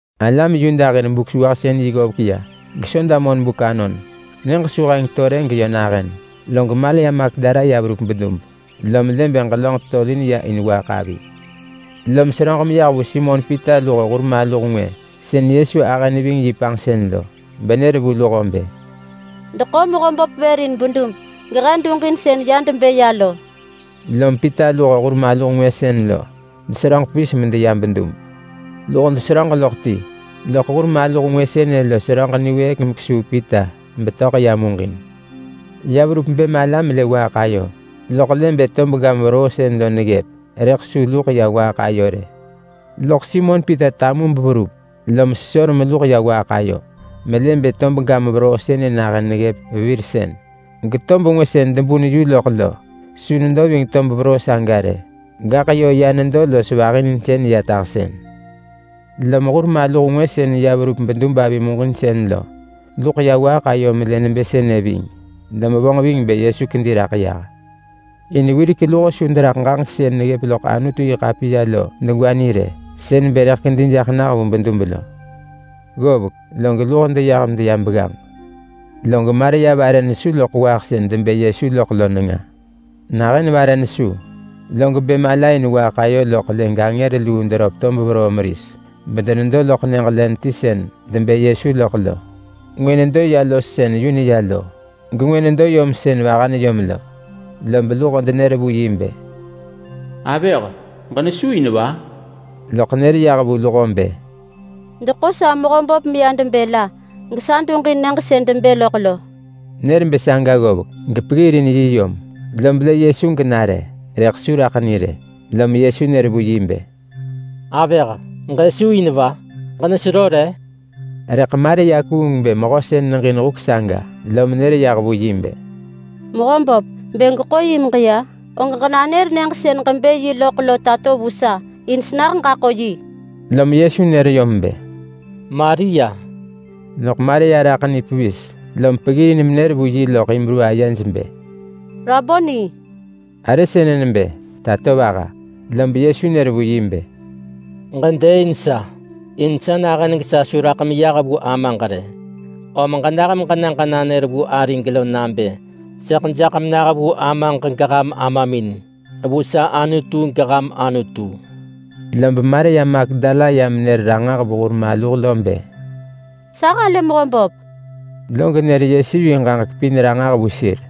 Alam Yuda hir Buk-sewahsën-yi ggovek ya geSoda monbuk anon. Nyëġ su heng to rë geyö nahën, log Maria Magdala ya verup bedub, lom lë bë ġelönġ tetolin ya in waaḳ avi. Lom seröġ meya menër vu Simon Pita luho hur maluh ngwë sën Yesu ahë neving yi panġsën lo, benër vu luho bë, “Deḳo Mehöböp vër in bedub gehe duġin sën ya debë lo!” Lom Pita luho hur maluh ngwë sën lo deseröġ pevis medeya bedub. Luho deseröġ loḳ ti, loḳ hur maluh ngwë sënë lo seröġ niwëëk mekesuu Pita betöḳ ya muġin. Ya verup bë mala melë waaḳ ayo, loḳ lë bë tob gam veroo sën lo neggëp, rëḳ su luḳ ya waaḳ ayo rë. Loḳ Simon Pita tamu beverup, lom sesor meluḳ ya waaḳ ayo melë bë tob gam veroo sënë nahën neggëp vevirsën, getob ngwë sën debun yu loḳ lo su nedo ving tob veroo saga rë, gaḳ yö ya nedo los vahininsën ya tahsën. Lom hur maluh ngwë sën ya verup bedub avi muġinsën lo luḳ ya waaḳ ayo melë nebë sënë ving, lom vonġ ving bë Yesu kedi raḳ yah. In wirek luho su deraḳ ġaġek sën neggëp loḳ Anutu-yi-ḳapiya lo degwa ni rë. Sën neggëp nebë rëḳ kedi jaḳ nah vu bedub lo. Ggovek, log luho deyah medeya begganġ. Rëḳ Maria vare nesu loḳ waaḳ sën debë Yesu loḳ lo nenga. Nahën vare nesu, log bë mala in waaḳ ayo loḳ lë gangër luu deröp tob veroo meris bedenedo loḳ nyëġ len ti sën debë Yesu loḳ lo. Ngwë nedo ya los sën yu neya lo, gengwë nedo yom sën vaha neyom lo. Lob luho denër vu yi bë, “Avëh, ġenesu in va?” Loḳ nër yah vu luho bë, “Deḳo sa Mehöböp meya debë la, gesa duġin nyëġ sën debë loḳ lo!” Nër bë saga ggovek gepeggirin yi yom, lob lë Yesu genare, rëḳ su raḳ ni rë. Lom Yesu nër vu yi bë, “Avëh! Ġësu in va? Ġenesero re?” Rëḳ Maria kuung bë mehö sën neġin huk saga, lom nër yah vu yi bë, “Mehö böp, bë gweḳo yi meġeya, og ġenanër nyëġ sën ġebë yi loḳ lo tato vu sa, in senah ġaḳo yi!” Lom Yesu nër yom bë, “Maria!” Loḳ Maria raḳ ni pevis lom peggirin menër vu yi loḳ Hibru ayej bë, “Raboni!” (Arë sënë nebë Tatovaha.) Lob Yesu nër vu yi bë, “Ġedëëin sa! In sa nahën gesa su raḳ meyah vu Amaġ rë. Om ġenah meġena ġenanër vu arig lo nabë, ‘Sëḳ jaḳ menah vu Amaġ geham Amamin, vu sa Anutu geham Anutu.’” Lob Maria Magdala ya menër ranġah vu hur maluh bë, “Sa halë Mehöböp!”, log nër Yesu yi ġaġek pin ranġah vu sir.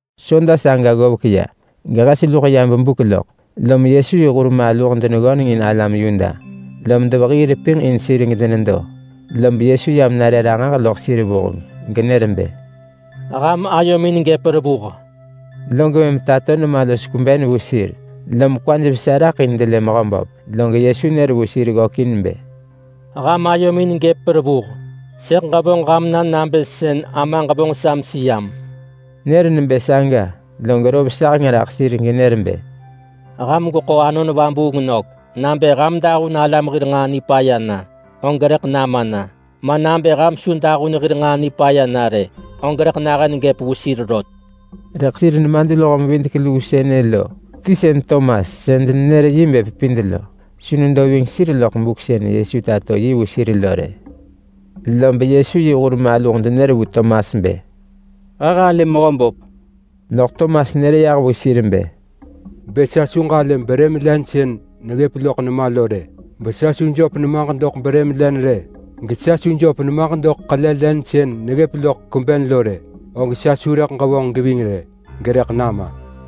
Soda saga ggovek ya gehes luḳ ya bebuk loḳ, lom Yesu yi hur maluh deneggöneng in alam Yuda, lom devehii repinġ in sir gedenedo. Lob Yesu yam nare ranġah loḳ sir vuheng genër bë, “Ham ayomin gëp revuh!” Log mëm tato nema los kweben vu sir, lom kwaj vesa raḳ in delë Mehöböp. Log Yesu nër vu sir ggökin bë, “Ham ayomin gëp revuh! Sëḳ ġevonġ ham na nabë sën Amaġ vonġ sa meseyam.” Nër nebë saga, log rov saheng raḳ sir genër bë, “Ham gweḳo Anon Vabuung nök! Nabë ham dahun alam hir nġaa nipaya na, og rëḳ nama na, ma nabë ham su dahun hir nġaa nipaya na rë, og rëḳ nahën gëp vu sir rot.” Rëḳ sir nemadluho-mevidek-luu sënë lo ti sën Tomas (sën denenër yi bë Pepid lo), su nedo ving sir loḳ buk sën Yesu tato yi vu sir lo rë. Lob Yesu yi hur maluh denër vu Tomas bë, “He halë Mehöböp!” Loḳ Tomas nër yah vu sir bë, “Bë sa su ġalë brëm len sën neggëp loḳ nema lo rë, besa su jöp nemaġ doḳ brëm len rë, gesa su jöp nemaġ doḳ ḳele len sën neggëp loḳ kweben lo rë, og sa su rëḳ ġevonġ geving rë, gerëḳ nama!”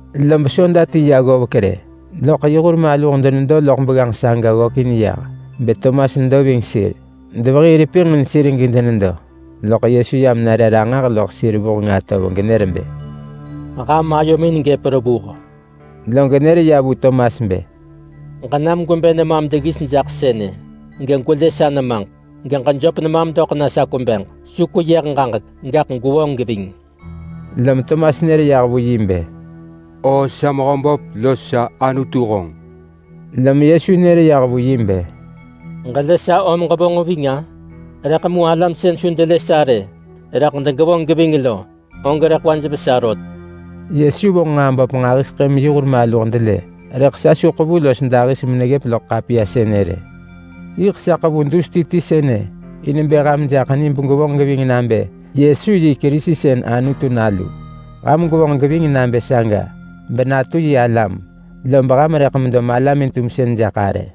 Lob soda ti ya ggovek rë, loḳ yi hur maluh denedo loḳ begganġ saga ggökin yah beTomas nedo ving sir. Devehii repinġ in sir gedenedo, loḳ Yesu yam nare ranġah loḳ sir vuheng atov genër bë, “Ham ayomin gëp revuh!” Log nër vu Tomas bë, “Ġenam gwebë nemam deggis jaḳ sënë, gegwelë sa nemaġ. Geġejöp nemam doḳ sa kwebeġ. Su kweyëh ġaġek, gaḳ gwevonġ geving!” Lom Tomas nër yah vu yi bë, “O sa Mehöböp los sa Anutu honġ!” Lom Yesu nër yah vu yi bë, “Ġelë sa om ġevonġ ving-a? Rëḳ mu alam sën su delë sa rë, rëḳ degevonġ geving lo, og rëḳ kwaj vesa rot.” Yesu vonġ nġaa böp nġahiseḳë meyi hur maluh delë, rëḳ sa su ḳevu los dahis meneggëp loḳ ḳapiya sënë rë. Yiḳ sa ḳevu dus ti ti sënë in bë ham jaḳ ni begwevonġ geving nabë Yesu yi Kerisi sën Anutu Nalu. Ham gwevonġ geving nabë saga benatu yi alam lob ham rëḳ medo malamin-tumsën jaḳ arë.